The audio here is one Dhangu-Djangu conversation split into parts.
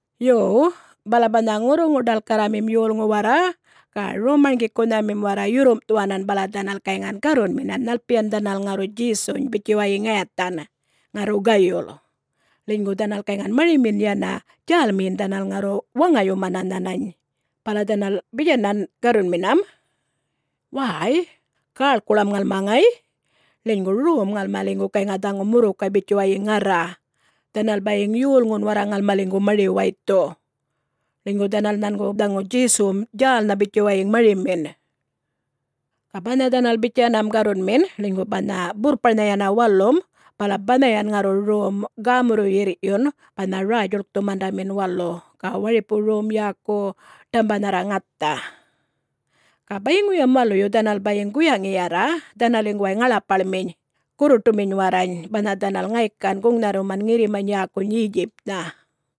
Yo, bala banha ŋurruŋu-ḏalkarramim yolŋu warra ga rom-marŋgikunhamim warra yurrumꞌthuwanan bala dhanal gayŋan garrunminan nhalpiyan dhanal ŋarru Djesuny bitjuwayiŋ ŋayathan, ŋarru gayul, ḻinygu dhanal gayŋan marimin yana djälmiyin dhanal ŋarru waŋayumana nhanany, bala dhanal bitjanan garrunminam, “Wäy, gäḻkuḻam ŋalma ŋay, ḻinygu rom ŋalmaliŋgu gayŋa dhaŋu murrukay bitjuwayiŋ ŋarra. Dhanal bayiŋ yolŋun warra ŋalmaliŋgu mari-waythu, ḻinygu dhanal nhangu dhaŋu Djesuwum djälnha bitjuwayiŋ marimin.” Ga banha dhanal bitjanam garrunmin ḻinygu banha burrparnha yana walum bala banhayan ŋarru rom gämurruꞌyirryun banha Räy-djuḻkthumandamin Walu ga waripu rom yäku Ḏambanharra Ŋatha. Ga bayiŋuyam waluyu dhanal bayiŋ guyaŋiyarra dhanaliŋguway ŋaḻapaḻminy, gurruṯuminy warrany, banha dhanal ŋaykan guŋnharruman ŋirrimany yäkuny Yetjipnha.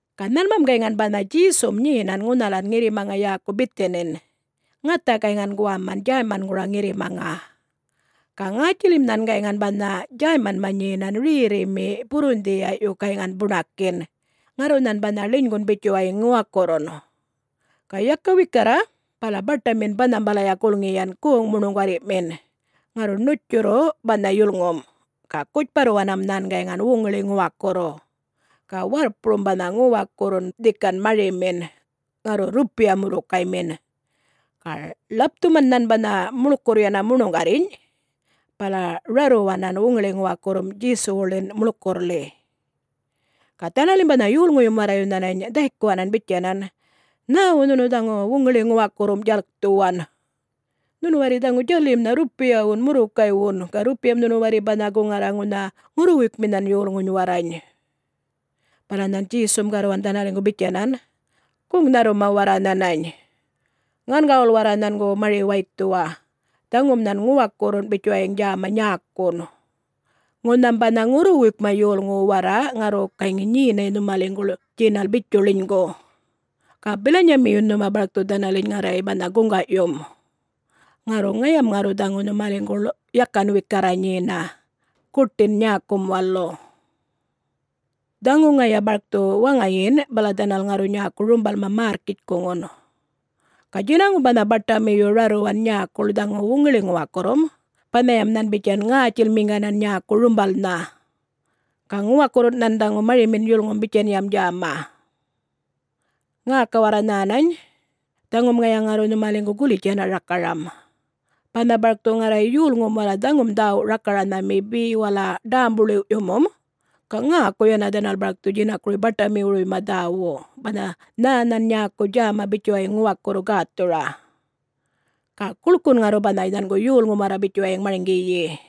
Ga nhanmam gayŋan banha Djesum nyenan ŋunhalan ŋirrimaŋa yäkuŋa Bithanin, ŋatha gayŋan guwaman Djäymangura ŋirrimaŋa. Ga ŋätjilim nhan gayŋan banha Djäymanma nyenan rerrimi, burrundhiyaꞌyu gayŋan buṉakin. Ŋarru nhan banha ḻinygun bitjuwayiŋ ŋuwakurrun. Ga yaka wikarra bala baṯamin banhambalaya gulŋiyan goŋ muṉuŋgarriꞌmin, ŋarru ṉutjurru banha yulŋum. Ga gutjparruwanam nhan gayŋan wuŋiḻi-ŋuwakurru, ga warrpurum banha ŋuwakurrun dhika marimin, ŋarru rrupiya murrukaymin. Ga ḻapthuman nhan banha muḻkurr yana muṉuŋgarrinyꞌ, bala rarruwanan wuŋiḻi-ŋuwakurrum Djesuwuḻin muḻkurrḻi. Ga dhanalim banha yolŋuyum warrayu nhanany dhaykuwanan bitjanan, “Nhäwu nhunu dhaŋu wuŋiḻi-ŋuwakurrum djalkthuwan? Nhunu warri dhaŋu djalimnha rrupiyawun murrukaywun, ga rrupiyam nhunu warri banha guŋarra ŋunha ŋurruwuykminhan yolŋuny warrany.” Bala nhan Djesum garruwan dhanaliŋgu bitjanan, “Guŋnharruma warra nhanany. Ŋangawul warra nhangu mari-waythuwa. Dhaŋum nhan ŋuwakurrun bitjuwayiŋ djäma nyäkun. Ŋunham banha ŋurruwuykma yolŋu warra ŋarru gayŋi nyenay nhumaliŋguḻ djinal bitju ḻinygu, ga bilanyamiyun nhuma barkthu dhanaliny ŋarray banha guŋgaꞌyum. Ŋarru ŋayam ŋarru dhaŋu nhumaliŋguḻ yakan wikarra nyena, guṯin nyäkum walu. Dhaŋu ŋaya barkthu waŋayin bala dhanal ŋarru nyäku rumbalma märrkitjkuŋun. Ga djinaŋum banha baṯamiyu rarruwan nyäkuḻ dhaŋu wuŋiḻi-ŋuwakurrum, banhayam nhan bitjan ŋätjilmiŋganan nyäku rumbalnha. Ga ŋuwakurrun nhan dhaŋu marimin yulŋum bitjanyam djäma. Ŋäka warra nhänany. Dhaŋum ŋaya ŋarru nhumaliŋgu gulitj yana rakaram. Banha barkthu ŋarray yolŋum warra dhaŋum dhäwu rakaranhami be wala ḏämbu-ḻiwꞌyumum, ga ŋäku yana dhanal barkthu djinakuruy baṯamiwuruyma dhäwu, banha nhä nhan nyäku djäma bitjuwayiŋ ŋuwakurru gäthura. Ga guḻkun ŋarru banha nhangu yolŋum warra bitjuwayiŋ marŋgiyi.”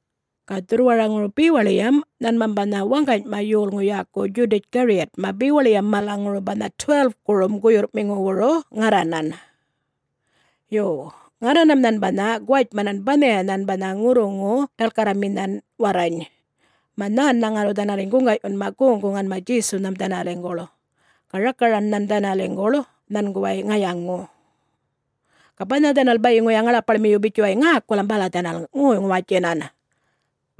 Ga dhurrwaraŋuru bewaḻiyam nhanmam banha waŋganyma yolŋu yäku Djudatj-Gariyatma bewaḻiyam malaŋuru banha 12-kurum guyurrꞌmiŋuwuru ŋarranan. Yo, ŋarranam nhan banha guwatjmanam banhayanhan banha ŋurruŋu-ḏalkarraminhan warrany, mä nhännha ŋarru dhanaliny guŋgaꞌyunma goŋ-guŋanma Djesunham dhanaliŋguḻ. Ga rakaran nhan dhanaliŋguḻ nhanguway ŋayaŋu. Ga banha dhanal bayiŋuya ŋaḻapaḻmiyu bitjuwayiŋ ŋäkulam bala dhanal ŋoy-ŋuwatjinan.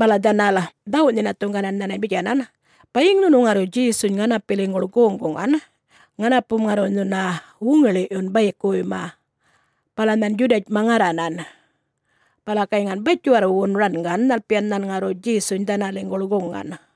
Bala dhanal dhawuꞌ-nhinathuŋganan nhanany bitjanan, “Bayiŋ nhunu ŋarru Djesuny ŋanapiliŋguḻ goŋ-guŋan, ŋanapum ŋarru nhuna wuŋiḻiꞌyuna bayikuwuyma.” Bala nhan Djudatjma ŋarranan, bala gayŋan batjiwarrwun rangan nhalpiyan nhan ŋarru Djesuny dhanaliŋguḻ guŋan.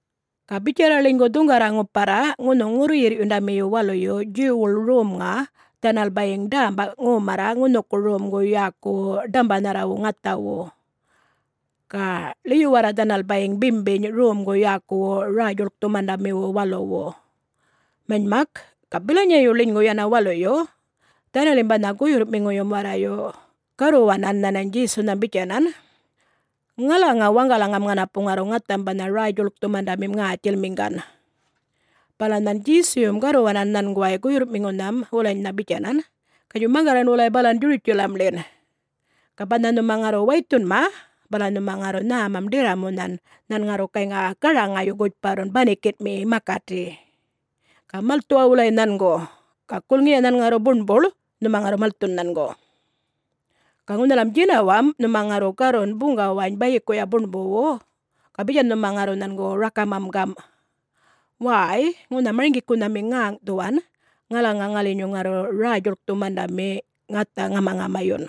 Ga bitjarra ḻinygu dhuŋgarra ŋuparra ŋunhuŋ ŋurruyirrꞌyundamiyu waluyu Djuwwuḻ Romŋa, dhanal bayiŋ dämba ŋomarra ŋunhuku romgu yäkuwu Ḏambanharrawu Ŋathawu, ga ḻiyuwarra dhanal bayiŋ bimbiny romgu yäkuwu Räy-djuḻkthumandamiwu Waluwu. Manymak, ga bilanyayu ḻinygu yana waluyu, dhanalim banha guyurrꞌmiŋuyum warrayu garruwanan nhanany Djesunham bitjanan, “Ŋalaŋa waŋgalaŋam ŋanapu ŋarru ŋatham banha Räy-djuḻkthumandamim ŋätjilmiŋgan?” Bala nhan Djesuyum garruwanan nhanguway guyurrꞌmiŋunhan wulanynha bitjanan, “Gatjuy maŋgarran wulay balan Djurutjalamḻin. Ga banha nhuma ŋarru waythunma bala nhuma ŋarru nhämam ḏirramunhan nhan ŋarru gayŋa garaŋayu gutjparrun banikinꞌmi makati. Ga malthuwa wulay nhangu, ga gulŋiya nhan ŋarru buṉbuḻ, nhuma ŋarru malthun nhangu. Ga ŋunhalam djinawamꞌ nhuma ŋarru garrun buŋgawany bayikuya buṉbuwu, ga bitjan nhuma ŋarru nhangu rakaramam gamꞌ, ‘Wäy, ŋunha Marŋgikunhami ŋäŋꞌthuwan ŋalaŋa ŋalinyu ŋarru Räy-djuḻkthumandamim ŋatha ŋamaŋamayun,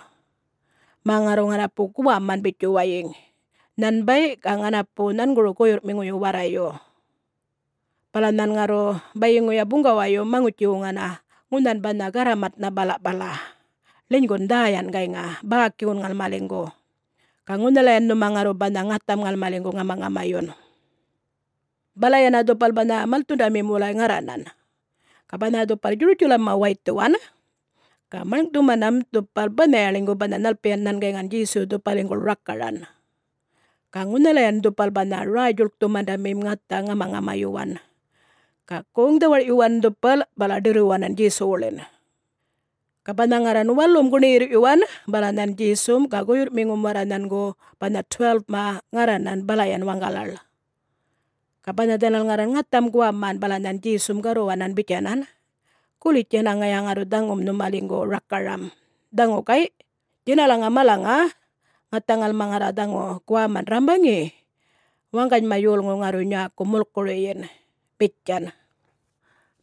mä ŋarru ŋanapu guwaman bitjuwayiŋ, nhanbay ga ŋanapu nhanguru guyurrꞌmiŋuyu warrayu.’ Bala nhan ŋarru bayiŋuya buŋgawayum maŋutji-wuŋana ŋunhan banha garramatnha balaꞌpala, ḻinygun dhäyan gayŋan, bäkiwun ŋalmaliŋgu, ga ŋunhalayan nhuma ŋarru banha ŋatham ŋalmaliŋgu ŋamaŋamayun.” Bala yana dhupal banha malthundamim wulay ŋarranan. Ga banha dhupal Djurutjalamma waythuwan, ga maḻŋꞌthumanam, dhupal banhaya ḻinygu banha nhalpiyan nhan gayŋan Djesuyu dhupaliŋguḻ rakaran. Ga ŋunhalayan dhupal banha Räy-djulkthumandamim ŋatha ŋamaŋamayuwan. Ga goŋ-dhawarꞌyuwan dhupal bala ḏirruwanan Djesuwuḻin. Ga banha ŋarran walum guṉiyirrꞌyuwan bala nhan Djesum ga guyurrꞌmiŋum warra nhangu banha 12-ma ŋarranan balayan waŋgalaḻ. Ga banha dhanal ŋarran ŋatham guwaman, bala nhan Djesum garruwanan bitjanan, “Gulitj yana ŋaya ŋarru dhaŋum nhumaliŋgu rakaram. Dhaŋu gayꞌ djinalaŋa malaŋa ŋatha ŋalma ŋarra dhaŋu guwaman rrambaŋi, waŋganyma yolŋu ŋarru nyäku mulkuruyin,” bitjan.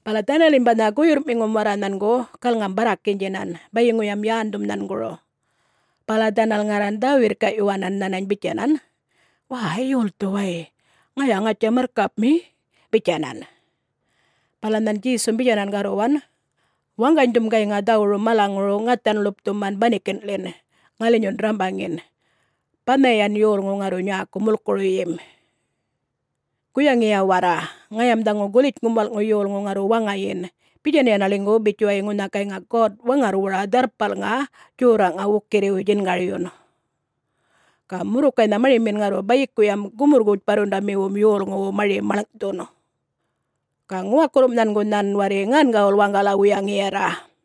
Bala dhanalim banha guyurrꞌmiŋum warra nhangu galŋam-barrakinydjinan bayiŋuyam yändhum nhanguru, bala dhanal ŋarran dhä-wirrkaꞌyuwanan nhanany bitjanan, “Wäy,... yolthu way... ŋaya ŋatja Marrkapmi?” bitjanan. Bala nhan Djesum bitjanan garruwan, “Waŋganydhum gayŋa dhawuru malaŋuru ŋathan ḻupthuman banikinꞌḻin, ŋalinyun rrambaŋin, banhayan yolŋu ŋarru nyäku mulkuruyim. Guyaŋiya warra, ŋayam dhaŋu Gulitjŋum Walꞌŋu Yolŋu ŋarru waŋayin bitjan yana ḻinygu bitjuwayiŋ ŋunha gayŋa God-Waŋarrwura Dharrpalŋa Djorraꞌŋa wukirriwuy djingaryun. Ga murrukaynha marimin ŋarru bayikuyam gumurryu-gutjparrundamiwum yolŋuwu mari maḻŋꞌthun. Ga ŋuwakurrum nhangu nhan warri ŋangawul waŋgala-wuyaŋiyarra.”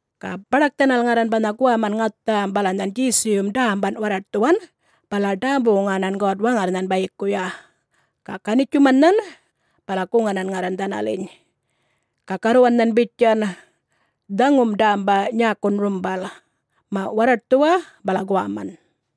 Ga baḏak dhanal ŋarran banha guwaman ŋatham, bala nhan Djesuyum dämban warraṯthuwan bala ḏämbu-wuŋanan God-Waŋarrnhan bayikuya. Ga ganitjuman nhan, bala guŋanan ŋarran dhanaliny. Ga garruwan nhan bitjan, “Dhaŋum dämba nyäkun rumbal. Maꞌ warraṯthuwa bala guwaman.”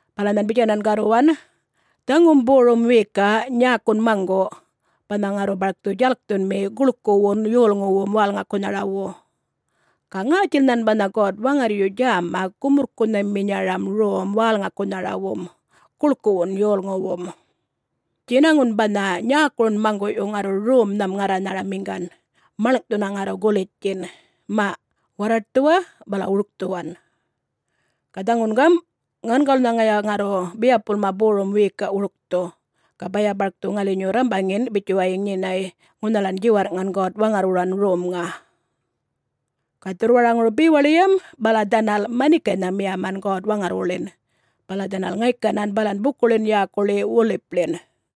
Bala nhan bitjanan garruwan, “Dhaŋum borum wiyikaꞌ nyäkun maŋguꞌ, banha ŋarru barkthu djalkthunmi guḻkuwun yolŋuwum wälŋakunharawu. Ga ŋätjil nhan banha God-Waŋarryu djäma gumurrkunhaminyara rom wälŋakunharawu guḻkuwu yolŋuwu. Djinaŋun banha nyäkurun maŋguꞌyu ŋarru romnham ŋarranharamiŋgan, maḻŋꞌthuna ŋarru gulitjtjin. Maꞌ warraṯthuwa bala wurkthuwan. Ga dhaŋun gamꞌ, ŋangawulnha ŋaya ŋarru biyapulma borum wiyikaꞌ wurkthu, ga baya barkthu ŋalinyu rrambaŋin bitjuwayiŋ nyenay ŋunhalan djiwarrꞌŋan God-Waŋarrwuran romŋa.” Ga dhurrwaraŋuru bewaḻiyam bala dhanal manikaynha miyaman God-Waŋarrwuḻin. Bala dhanal ŋaykanan balan bukuḻin yäkuḻi Wolipḻin.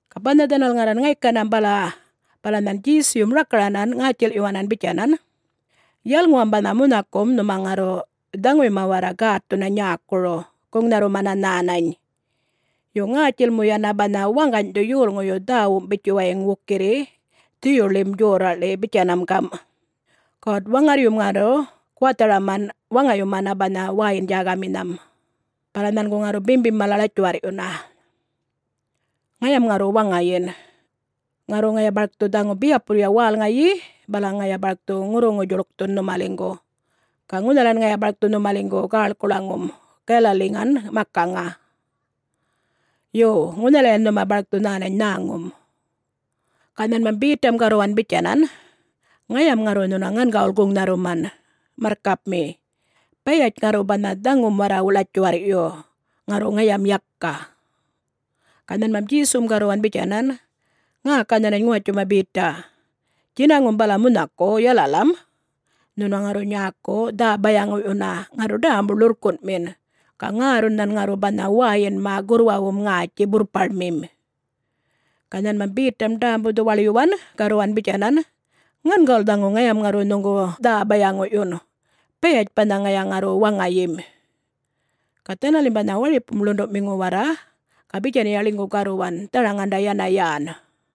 Ga banha dhanal ŋarran ŋaykanam bala, bala nhan Djesuyum rakaranan ŋätjilꞌyuwanan bitjanan, “Yalŋuwam banha munhakum nhuma ŋarru dhaŋuyma warra gätthuna nyäkuru, guŋnharrumana nhänany. Yo, ŋätjil mu yana banha waŋganydhu yolŋuyu dhäwum bitjuwayiŋ wukirri Dhuyuḻim Djorraꞌḻi bitjanam gamꞌ, ‘God-Waŋarryum ŋarru guwatharaman waŋayumana banha wäyin-djägaminham, bala nhangu ŋarru bimbim mala ḻatjuwarrꞌyuna.’ Ŋayam ŋarru waŋayin. Ŋarru ŋaya barkthu dhaŋu biyapulya wälŋayi bala ŋaya barkthu ŋurruŋu-djuḻkthun nhumaliŋgu, ga ŋunhalan ŋaya barkthu nhumaliŋgu gäḻkuḻaŋum Galaliŋan makaŋa. Yo, ŋunhalayan nhuma barkthu nhänany nhäŋum.” Ga nhanmam Betam garruwan bitjanan, “Ŋayam ŋarru nhuna ŋangawul guŋnharruman, marrkapmi, bayatj ŋarru banha dhaŋum warra ḻatjuwarrꞌyu, ŋarru ŋayam yaka.” Ga nhanmam Djesum garruwan bitjanan, “Ŋäka nhänany ŋuwatjuma Beta. Djinaŋum bala munhaku, yalalam, nhunu ŋarru nyäku dhä-bayaŋuꞌyuna ŋarru ḏämbu-ḻurrkunꞌmin, ga ŋärrun nhan ŋarru banha wäyinma gurrwawum ŋätji burrparmim.” Ga nhanmam Betam ḏämbu-dhuwaḻyuwan garruwan bitjanan, “Ŋangawul dhaŋu ŋayam ŋarru nhuŋgu dhä-bayaŋuꞌyun, bayatj banha ŋaya ŋarru waŋayim!” Ga dhanalim banha waripum ḻunduꞌmiŋu warra ga bitjanya ḻinygu garruwan dharaŋanda yana yän.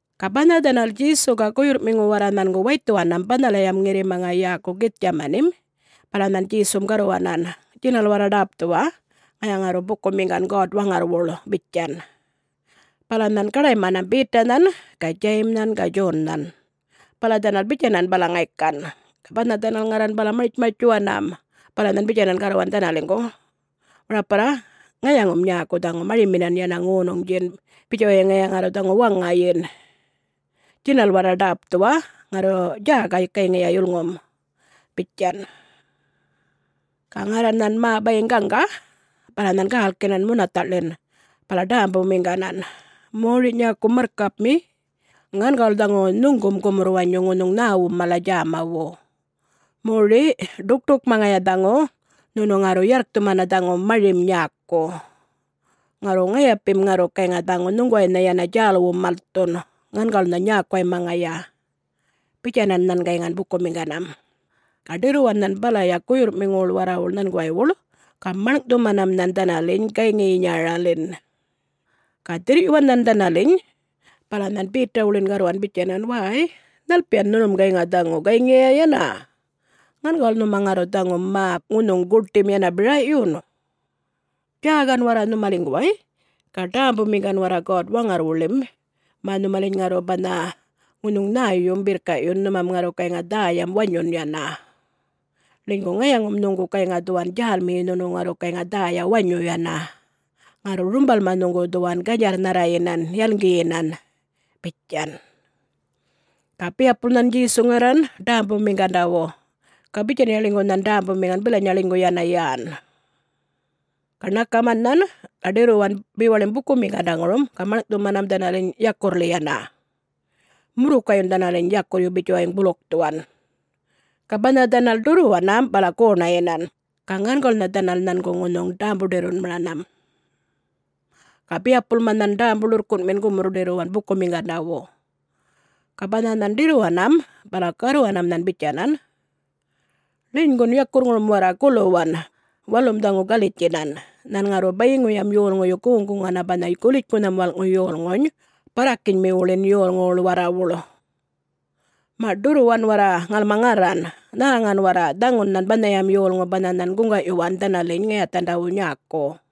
Ga banha dhanal Djesu ga guyurrꞌmiŋu warra nhangu waythuwanam banhalayam ŋirrimaŋa yäkuŋa Githtjamanim, bala nhan Djesum garruwanan, “Djinal warra ḏäpthuwa, ŋaya ŋarru bukumiŋgan God-Waŋarrwuḻ,” bitjan. Bala nhan gaḏaymanam Betanhan ga Djayimnhan ga Djonnhan, bala dhanal bitjanan bala ŋaykan. Ga banha dhanal ŋarran bala martj-martjuwanam, bala nhan bitjanan garruwanam dhanaliŋguḻ, “Waraparra, ŋayaŋum nyäku dhaŋu mariminan yana ŋonuŋdjin bitjuwayiŋ ŋaya ŋarru dhaŋu waŋayin. Djinal warra ḏäpthuwa, ŋarru djäka gayŋiya yulŋum,” bitjan. Ga ŋarran nhan mä bayiŋ gaŋga, bala nhan gälkinan munathaꞌḻin bala ḏämbumiŋganan, “Mori nyäku marrkapmi, ŋangawulnha dhaŋu nhuŋgum gumurr-wanyu ŋunhuŋ nhäwum mala djämawu. Moriꞌ, ḏukṯukma ŋaya dhaŋu nhunu ŋarru yarrkthumana dhaŋu marim nyäku. Ŋarru ŋayapim ŋarru gayŋa dhaŋu nhuŋguwaynha yana djälwum malthun, ŋangawulnha nyäkuwayma ŋaya,” bitjanan nhan gayŋan bukumiŋganam. Ga ḏirruwan nhan balaya guyurrꞌmiŋuwuḻ warrawuḻ nhanguwaywuḻ ga maḻŋꞌthumanam nhan dhanaliny gayŋiyinyaraḻin. Ga dhirrꞌyuwan nhan dhanaliny, bala nhan Betawuḻin garruwan bitjanan, “Wäy, nhalpiyan nhunum gayŋa dhaŋu, gayŋiya yana? Ŋangawul nhuma ŋarru dhaŋu mä ŋunhuŋ guṯim yana biraꞌyun? Djäka warra nhumaliŋguway, ga ḏämbumiŋgan warra God-Waŋarrwuḻin mä nhumaliny ŋarru banha ŋunhuŋ nhäyum birrkaꞌyun, nhumam ŋarru gayŋa dhäyam wanyun yana. Ḻinygu ŋayaŋum nhuŋgu gayŋa dhuwan djälmiyi nhunu ŋarru gayŋa dhäya wanyu yana, ŋarru rumbalma nhuŋgu dhuwan ganydjarrnharrayinan yalŋgiyinan,” bitjan. Ga biyapulya nhan Djesu ŋarran ḏämbumiŋgandawu, ga bitjanya ḻinygu nhan ḏämbumiŋgan bilanyaya ḻinygu yana yän. Ga ṉakaman nhan, ga ḏirruwan bewaḻim bukumiŋgandaŋurum ga maḻŋꞌthumanam dhanaliny yakurrḻi yana, murrukayyun dhanaliny yakurryu bitjuwayiŋ bulukthuwan. Ga banha dhanal ḏurruwanam bala goṉayinan, ga ŋangawulnha dhanal nhangu ŋunhuŋ ḏämbu-ḏirrunmaranam. Ga biyapulma nhan ḏämbu ḻurrkunꞌmin gumurr-ḏirruwan bukumiŋgandawu. Ga banha nhan ḏirruwanam bala garruwanam nhan bitjanan, “Ḻinygun yakurrŋurum warra guluwan! Walum dhaŋu galitjinan, nhan ŋarru bayiŋuyam yolŋuyu goŋ-guŋana banha Gulitjŋunham Walꞌŋu Yolŋuny barrakinymiwuḻin yolŋuwuḻ warrawuḻ. Maꞌ! Ḏurruwan warra ŋalma ŋarran. Nhäŋan warra, dhaŋun nhan banhayam yolŋu banha nhan guŋgaꞌyuwan dhanaliny ŋayathandawu nyäku.”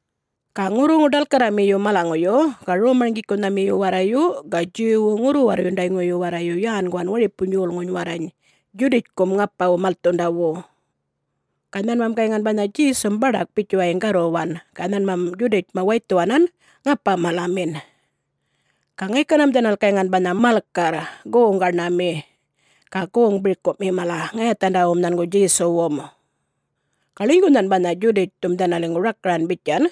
Ga ŋurruŋu-ḏalkarramiyu malaŋuyu ga rom-marŋgikunhamiyu warrayu ga Djuwwu ŋurru-warrundayŋuyu warrayu yänguwan waripuny yolŋuny warrany Djudatjkum ŋapawu malthundawu. Ga nhanmam gayŋan banha Djesum baḏak bitjuwayiŋ garruwan, bala nhanmam Djudatjma waythuwanan ŋapa-malamin. Ga ŋaykanam dhanal gayŋan banha malkarr, goŋ gaṉami, ga goŋ birkuꞌmi mala, ŋayathandawum nhangu Djesuwum. Ga ḻinygu nhan banha Djudatjthum dhanaliŋgu rakaran bitjan,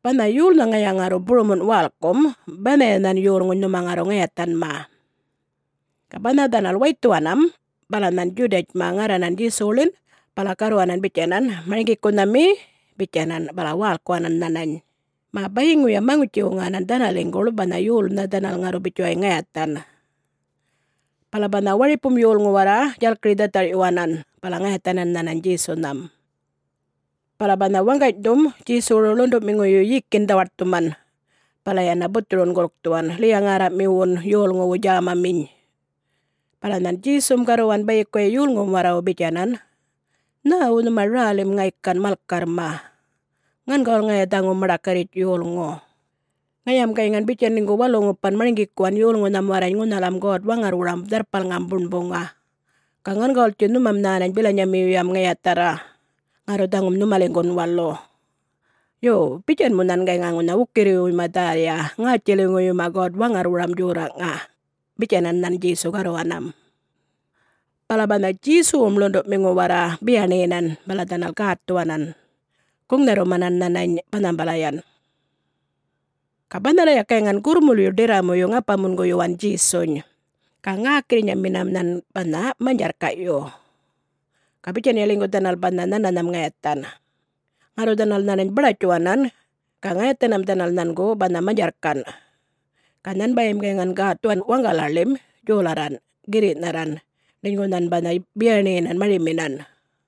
“Banha yolnha ŋaya ŋarru burumunꞌ wälkum banhayanhan yolŋuny nhuma ŋarru ŋayathanma.” Ga banha dhanal waythuwanam bala nhan Djudatjma ŋarranan Djesuwuḻin bala garruwanan bitjanan, “Marŋgikunhami,” bitjanan, bala wälkuwanan nhanany, mä bayiŋuyam maŋutji-wuŋanan dhanaliŋguḻ banha yolnha dhanal ŋarru bitjuwayŋ ŋayathan. Bala banha waripum yolŋu warra djalkiri-dhatharꞌyuwanan bala ŋayathanan nhanany Djesunham. Bala banha waŋganydhum Djesuwuru ḻunduꞌmiŋuyu yikin dhawaṯthuman bala yana buthurun gulkthuwan, ḻiya-ŋärramiwun yolŋuwu djämaminy. Bala nhan Djesum garruwan bayikuya yolŋuwum warrawu bitjanan, “Nhäwu nhuma rälim ŋaykan malkarrma? Ŋangawul ŋaya dhaŋu maḏakarritj yolŋu. Ŋayam gayŋan bitjan ḻinygu walu-ŋupan marŋgikuwan yolŋunham warrany ŋunhalam God-Waŋarrwuram Dharrpalŋam Buṉbuŋa, ga ŋangawultji nhumam nhänany bilanyamiyuyam ŋayatharra... ŋarru dhaŋun nhumaliŋgu walum. Yo, bitjan mu nhan gayŋa ŋunha wukirriwuyma dhäya ŋätjiliŋuwuyma God-Waŋarrwuram Djorraꞌŋa,” bitjanan nhan Djesu garruwanam. Bala banha Djesuwum ḻunduꞌmiŋu warra biyaṉiyinan bala dhanal gätthuwanan, guŋnharrumanan nhanany banhambalayan. Ga banhalaya gayŋan gurrmulyu ḏirramuyu ŋapa-munguyuwan Djesuny, ga ŋäkirriyumanminam nhan banha manydjarrkaꞌyu. Ga bitjanya ḻinygu dhanal banha nhananham ŋayathan. Ŋarru dhanal nhanany baḏatjuwanan ga ŋayathanam dhanal nhangu banha manydjarrkanꞌ. Ga nhanbayim gayŋan gätthuwan waŋgalaḻim djolarranꞌ, girriꞌnharran ḻinygu nhan banha biyaṉiyinan mariminan.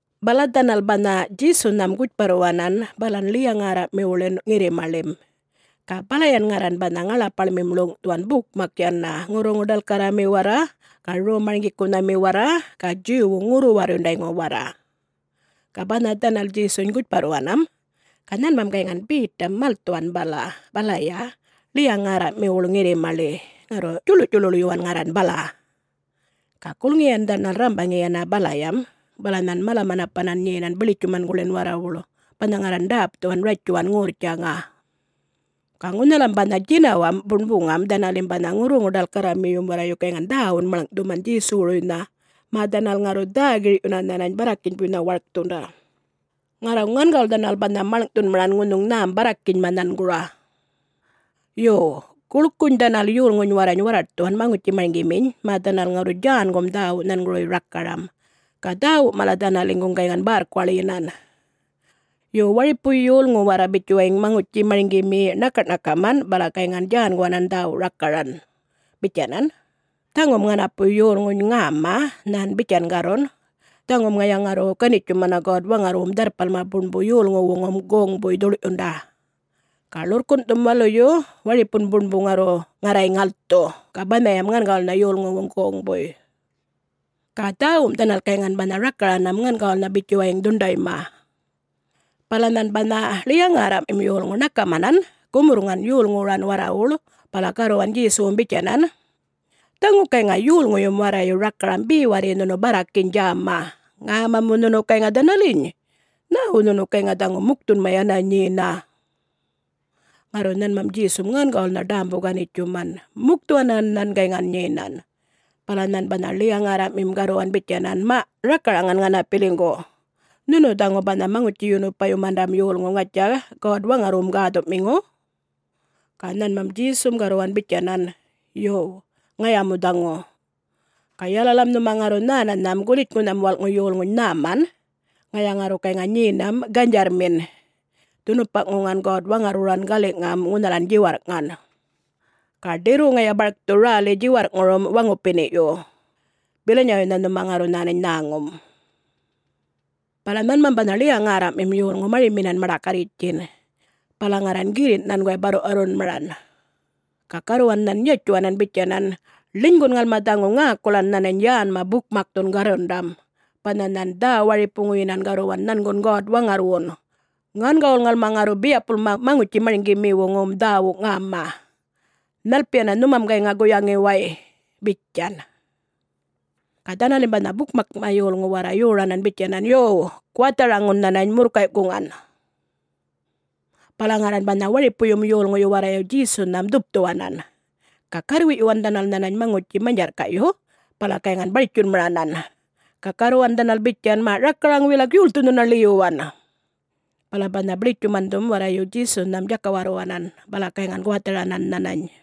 Bala dhanal banha Djesunham gutjparruwanan balan ḻiya-ŋärraꞌmiwuḻin ŋirrimaḻim. Ga balayan ŋarran banha ŋaḻapaḻmim ḻuŋꞌthuwan bukmak yana, ŋurruŋu-ḏalkarrami warra ga Rom-marŋgikunhami warra ga Djuwwu ŋurru-warrundayŋu warra. Ga banha dhanal Djesuny gutjparruwanam, ga nhanmam gayŋan Betam malthuwan bala, balaya ḻiya-ŋärraꞌmiwuḻ ŋirrimaḻi, ŋarru djuḻuꞌdjuḻuḻyuwan ŋarran bala. Ga gulŋiyan dhanal rrambaŋi yana balayam, bala nhan mala-manapanan nyenan biḻitjumanguḻin warrawuḻ banha ŋarran ḏäpthuwan ratjuwan ŋorrtjaŋa. Ga ŋunhalam banha djinawamꞌ buṉbuŋam dhanalim banha ŋurruŋu-ḏalkarramiyum warrayu gayŋan dhäwunꞌ maḻŋꞌthuman Djesuwuruynha, mä dhanal ŋarru dhä-girꞌyuna nhanany barrakinybuynha warkthunda. Ŋarru ŋangawul dhanal banha maḻŋꞌṯhunmaran ŋunhuŋ nhäm barrakinyma nhangura. Yo, guḻkuny dhanal yolŋuny warrany warraṯthuwan maŋutji-marŋgiminy mä dhanal ŋarru djänguman dhäwu nhanguruy rakaram, ga dhäwum mala dhanaliŋguŋ gayŋan bärrkuwaḻyinan. Yo, waripu yolŋu warra bitjuwayiŋ maŋutji-marŋgimi ṉakaꞌ-ṉakaman bala gayŋan djänguwanan dhäwu rakaran bitjanan, “Dhaŋum ŋanapu yolŋuny ŋäma nhan bitjan garrun, ‘Dhaŋum ŋaya ŋarru ganitjumana God-Waŋarrwum Dharrpalma Buṉbu yolŋuwuŋum goŋbuy dhuḻꞌyunda. Ga ḻurrkunꞌthum waluyu waripun buṉbu ŋarru ŋarray ŋalthu, ga banhayam ŋangawulnha yolŋuwuŋ goŋbuy.’” Ga dhäwum dhanal gayŋan banha rakaranam ŋangawulnha bitjuwayiŋ dhuṉḏayma. Bala nhan banha ḻiya-ŋärraꞌmim yolŋu ṉakamanan gumurrŋan yolŋuwuran warrawuḻ bala garruwan Djesuwum bitjanan, “Dhaŋu gayŋa yolŋuyum warrayu rakaram be warri nhunu barrakiny djäma. Ŋäma mu nhunu gayŋa dhanaliny? Nhäwu nhunu gayŋa dhaŋu mukthunma yana nyena?” Ŋarru nhanmam Djesum ŋangawulnha ḏämbu-ganitjuman. Mukthuwanan nhan gayŋan nyenan. Bala nhan banha ḻiya-ŋärraꞌmim garruwan bitjanan, “Maꞌ, rakaraŋan ŋanapiliŋgu. Nhunu dhaŋu banha Maŋutji-yunupayumandam yolŋu ŋatja... God-Waŋarrwum gäthuꞌmiŋu?” Ga nhanmam Djesum garruwan bitjanan, “Yo, ŋaya mu dhaŋu. Ga yalalam nhuma ŋarru nhänanham Gulitjŋunham Walꞌŋu Yolŋuny nhäman, ŋaya ŋarru gayŋa nyenam ganydjarrmin, dhunupaꞌŋuŋan God-Waŋarrwuran galiꞌŋam ŋunhalan djiwarrꞌŋan. Ga ḏirru ŋaya barkthu räli djiwarrꞌŋurum waŋupiniꞌyu. Bilanyawuynha nhuma ŋarru nhänany nhäŋum.” Bala nhanmam banha ḻiya-ŋärraꞌmim yolŋu mariminan maḏakarritjin, bala ŋarran girrinꞌ nhanguway barruꞌwarrunmaran, ga garruwan nhan yatjuwanan bitjanan, “Ḻinygun ŋalma dhaŋu ŋäkulan nhanany yänma bukmakthun garrundam, banha nhan dhä-waripuŋuyinan garruwan nhangun God-Waŋarrwun. Ŋangawul ŋalma ŋarru biyapulma maŋutji-marŋgimiwuŋum dhäwu ŋäma. Nhalpiyana nhumam gayŋa guyaŋi way?” bitjan. Ga dhanalim banha bukmakma yolŋum warra yoranan yana bitjanan, “Yo, guwatharanharaŋun nhanany murrkayꞌkuŋan.” Bala ŋarran banha waripuyum yolŋuyu warrayu Djesunham dhupthuwanan. Ga garrwiꞌyuwan dhanal nhanany maŋutji manydjarrkaꞌyu bala gayŋan bartjunmaranan, ga garruwan dhanal bitjan, “Maꞌ rakaraŋ wilak, yolthu nhuna ḻiyuwan?” Bala banha biḻitjumandhum warrayu Djesunham djakawarruwanan, bala gayŋan guwatharanan nhanany.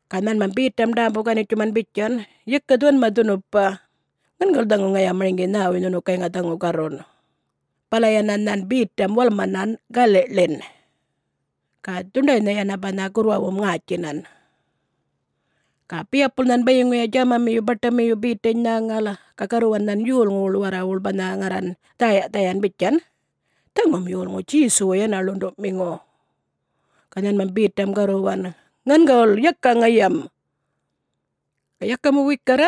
Ga nhanmam Betam ḏämbu-ganitjuman bitjan, “Yaka dhuwanma dhunupa. Ŋangawul dhaŋu ŋaya marŋgi nhäwuy nhunu gayŋa dhaŋu garrun.” Bala yana nhan Betam walmanan galiꞌḻin [ga dhuṉḏaynha yana banha gurrwawum ŋätjinan.] Ga biyapul nhan bayiŋuya djämamiyu baṯamiyu Betany nhäŋal, ga garruwan nhan yolŋuwuḻ warrawuḻ banha ŋarran dhäyaꞌ-dhayan bitjan, “Dhaŋum yolŋu Djesuwu yana ḻunduꞌmiŋu.” Ga nhanmam Betam garruwan, “Ŋangawul!... yaka ŋayam!” Ga yaka mu wikarra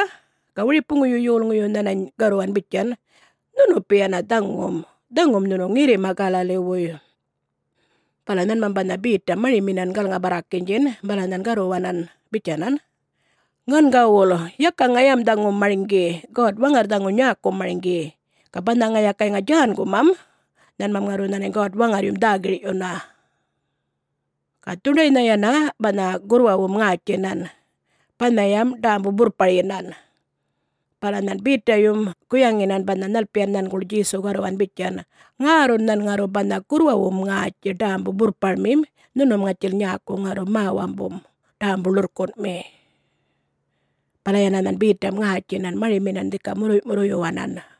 ga waripuŋuyum yolŋuyu nhanany garruwan bitjan, “Nhunupi yana dhaŋum, dhaŋum nhunu ŋirrima Galaliwuy.” Bala nhanmam banha Betam mariminan galŋa-barrakinydjin bala nhan garruwanam bitjanan, “Ŋangawul, yaka ŋayam dhaŋu marŋgi. God-Waŋarr dhaŋu nyäkum marŋgi, ga banha ŋaya gayŋa djängumam, nhanmam ŋarru nhänany God-Waŋarryum dhä-girꞌyuna.” Ga dhuṉḏaynha yana banha gurrwawum ŋätjinan, banhayam ḏämbu-burrparyinan. Bala nhan Betayum guyaŋinan banha nhalpiyan nhanguḻ Djesu garruwan bitjan, “Ŋärrun nhan ŋarru banha gurrwawum ŋätji ḏämbu-burrparmim, nhunum ŋatjil nyäku ŋarru mä-wambum ḏämbu-ḻurrkunꞌmi.” Bala yana nhan Betam ŋätjinan mariminan dhika murruyꞌ-murruyyuwanan.